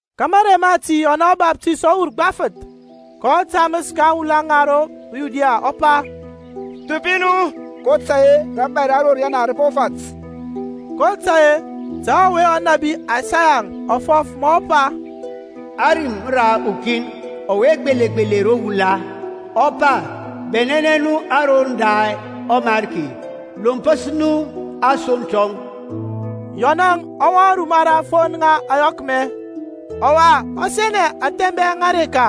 Ka mȧrey mati Yɔnȧŋ ɔBaftays ɔ wur gbafǝth, kɔ tamǝs ka aŋwula ŋa ro Yudia, ɔ pa, Thupi nu, kotȧy-e rȧbȧy ra ro riyana rǝ po fat. kotȧy-e ta ɔwe ɔnȧbi Aysayaŋ ɔ fɔf ma ɔ pa, Ȧrim ra ukin ɔwe gbelegbele ro wula, ɔ pa, Bɛnɛnɛ nu aroŋ da ɔMarki, Lompǝs nu asoŋ tɔŋ. Yɔnȧŋ ɔ wɔŋ ruma ra aŋfon ŋa ȧyɔkmɛ, ɔwa ɔ senɛ ȧthɛbɛŋ ŋa areka.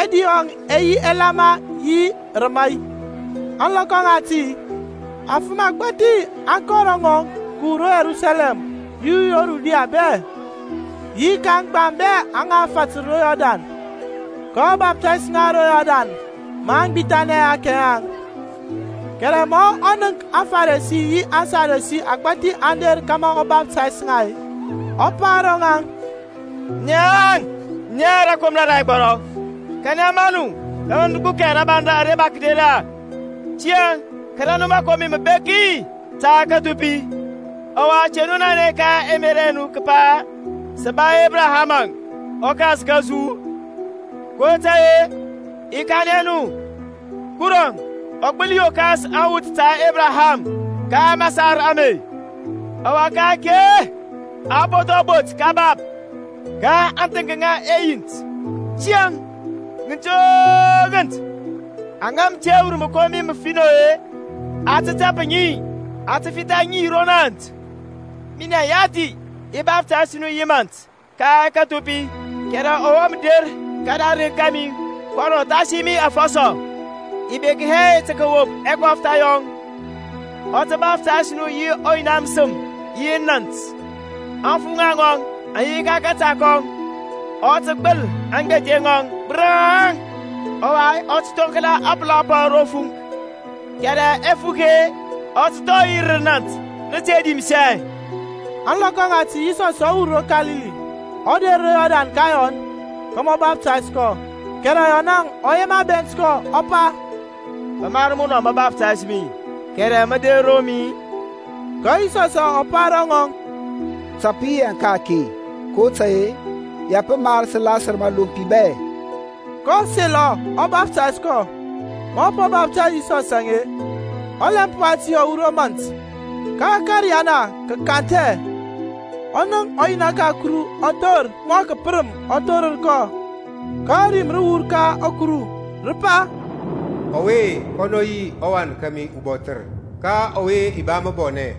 Ɛdi yɔŋ ɛ yi ɛlama yi rǝmai. Ȧŋlɔkɔ ŋati afǝm agbȧthi aŋ kɔ ro ŋɔŋ kǝwur ro Yerusalɛm yi ro Yudia bɛ, yi ka aŋgbaŋ bɛ aŋa fatǝr ro Yɔrdan. kɔ baftays ŋa ro Yɔrdan maŋ gbithanɛ ɛhakɛ yaŋ. Kɛrɛ ma ɔ nənk aFaresi yi aSadusi agbȧthi aŋ der kȧmȧ ɔ baftays ŋa, ɔ pa ro ŋaŋ, Naŋ, na rȧkomra ra ɛgbɔrɔ, kanɛ maŋ nu tǝ kǝgbukɛ rabaŋ ara mǝ der-e? Tiyȧŋ kȧrȧ nu mǝkomi mǝbeki ta kǝthupi. Ɔwa te nu nanɛ ka ɛmerȧ ɛ nu kǝpa, Sǝ ba Ebraham ta ɔkas kȧsu; kotȧy-e i kanɛ nu Kuruȧŋ ɔ gbǝli yokas awuth ta Ebraham ka masar ame. Ɔwa ka-ake a po thɔ bot kabap ka aŋthǝŋk ŋa ɛyint. Tiyȧŋ, ŋǝnt o ŋǝnt aŋa mǝ te wur mǝkomi mǝfinɔ-e, a tǝ tap ŋi, a tǝ fitha ŋi ro nȧnt. Minɛŋ yathi, i baftays nu yi mȧnt ka kǝthupi, kɛrɛ ɔwe mǝ der kǝdarǝŋ kȧmi kɔnɔ thasi mi afɔsɔ. I bek hɛ tǝ kǝwop ɛkɔftha yɔŋ. Ɔ tǝ baftays nu yi ɔYina mǝsǝm yi nȧnt. Aŋfuŋa ŋɔŋ aŋ yi ka kȧta kɔŋ, ɔ tǝ gbǝl aŋgbethe ŋɔŋ gbǝraŋ, ɔwa ɔ tǝ thoŋkla apǝla pɔŋ ro fuŋk, kɛrɛ ɛfuk-e, ɔ tǝ thɔi yi rǝ nȧnt nǝte dimsɛ. Ȧŋlɔkɔ ŋati Yisɔsȧŋ ɔ wur ro Kalili, ɔ der ro Yɔrdan ka Yɔn, kȧmȧ ɔ baftays kɔ. Kɛrɛ Yɔnȧŋ ɔ yema bɛnt kɔ, ɔ pa, Pǝ mar munɔ mǝ baftays mi, kɛrɛ mǝ der ro mi-i? Ka Yisɔsȧŋ ɔ pa ro ŋɔŋ, Ta pǝ yi yaŋ ka-ake, kotȧy-e ya pǝ mar sǝ lasǝr mȧlompi bɛ. Kɔ selɔ ɔ baftays kɔ. Ma a po baftays Yisɔs-e, ɔlɛmp wati ɔ wur ro mȧnt; ka ȧkȧriyana kǝ kanthɛ, kɔ nənk ɔYina ka Kuru ɔ thor mɔ kǝpǝrǝm ɔ thorǝr kɔ, ka rim rǝ wur ka Kuru, rǝ pa, Ɔwe-e, kɔnɔ yi ɔWan kȧmi ubɔthǝr, ka ɔwe i ba mǝbɔnɛ.